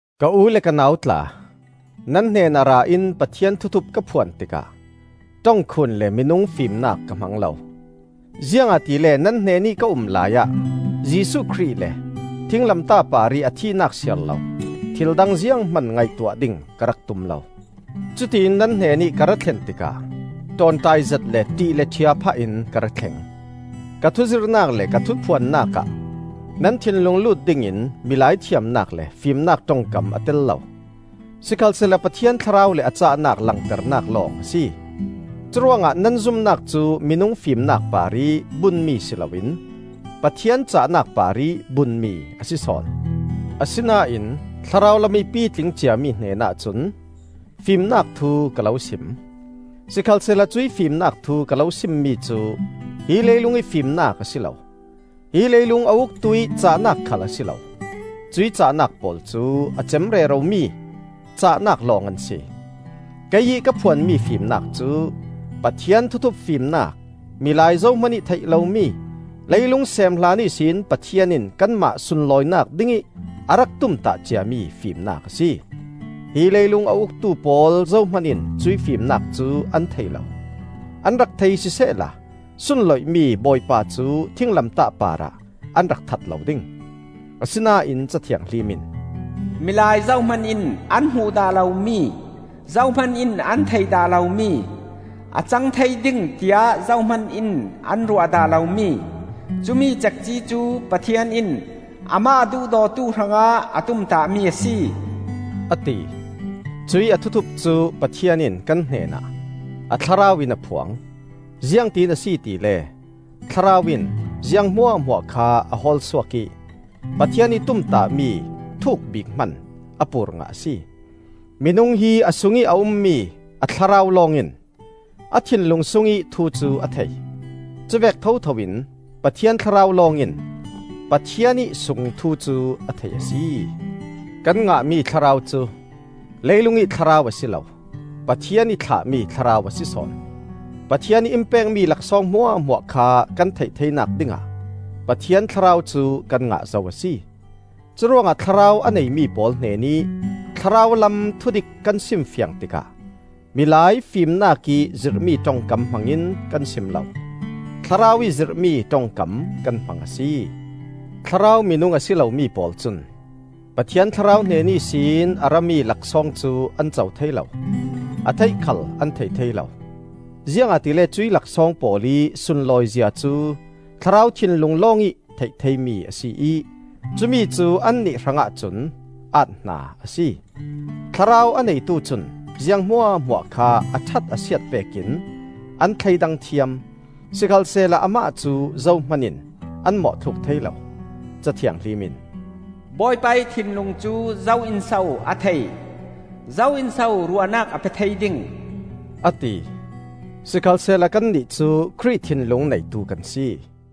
Ka u le ka nau tla, nan hnenah ra in Pathian thuthup ka phuan tikah ṭongkhun le minung fimnak ka hmang lo. Ziangahtile nan hnenih ka um laiah Jesuh Khrih le thinglamtah parih a thihnak siarlo thildang zianghman ngaihtuah ding ka rak tum lo. Cutiin nan hnenih ka ra thlen tikah ṭawnṭaizet le ṭih le ṭhia phahin ka ra thleng; ka thuzirhnak le ka thuphuannak ah nan thinlung lut dingin milai thiamnak le fimnak ṭongkam a tel lo, sikhalsehla Pathian Thlarau le a cahnak langternak lawng a si. Curuangah nan zumnak cu minung fimnak parih bunmi si loin Pathian cahnak parih bunmi a si sawn. Asinain thlarau lamih pitling ciami hnenah cun fimnak thu ka lo sim. Sikhalsehla cuih fimnak thu ka lo simmi cu hi leilungih fimnak a si lo, hi leilung a uktuih cahnak khal a si lo; cuih cahnak pawl cu a cem reromi cahnak lawng an si. Kei ih ka phuanmi fimnak cu Pathian thuthup fimnak, milai zohman ih theih lomi, leilung seem hlan ihsin Pathian in kanmah sunlawinak dingih a rak tumtah ciami fimnak a si. Hi leilung a uktu pawl zohman in cuih fimnak cu an thei lo. An rak thei sisehla sunloihmi Bawipa cu thinglamtah parah an rak that lo ding. Asinain Ca Thianghlim in, “Milai zohman in an hmuh dah lomi, Zohman in an theih dah lomi, A cangthei ding tiah zohman in an ruah dah lomi, Cumi cekci cu Pathian in Amah a duhdawtu hrangah A tumtahmi a si,” a ti. Cuih a thuthup cu Pathian in kan hnenah a Thlarau in a phuang. Ziangtin a si tile Thlarau in ziang hmuahhmuah kha a hawlsuak ih Pathian ih tumtahmi thuk bik hman a pur ngah a si. Minung hi a sungih a ummi a thlarau lawng in a thinlung sungih thu cu a thei. Cuvek thotho in Pathian Thlarau lawng in Pathian ih sung thu cu a thei a si. Kan ngahmi thlarau cu leilungih thlarau a si lo; Pathian ih thlahmi Thlarau a si sawn. Pathian ih in pekmi laksawng hmuahhmuah kha kan theih theinak dingah Pathian Thlarau cu kan ngah zo a si. Curuangah Thlarau a neimi pawl hnenih thlarau lam thudik kan simfiang tikah milai fimnakih zirhmi ṭongkam hmangin kan sim lo. Thlarau ih zirhmi ṭongkam kan hmang a si. Thlarau minung a si lomi pawl cun Pathian Thlarau hnen ihsin a rami laksawng cu an co thei lo; a theih khal an thei thei lo. Ziangahtile cuih laksawng pawl ih sunlawizia cu thlarau thinlung lawngih theih theimi a si ih cumicu annih hrangah cun aat-hna a si. Thlarau a neitu cun ziang hmuahhmuah kha a ṭhat a siat vekin an thleidang thiam; sikhalsehla amah cu zohman in an mawhthluk thei lo. Ca Thianghlim in, “Bawipa ih thinlung cu zo in so a thei? Zo in so ruahnak a pe thei ding?” a ti. Sikhalsehla kannih cu Khrih thinlung neitu kan si.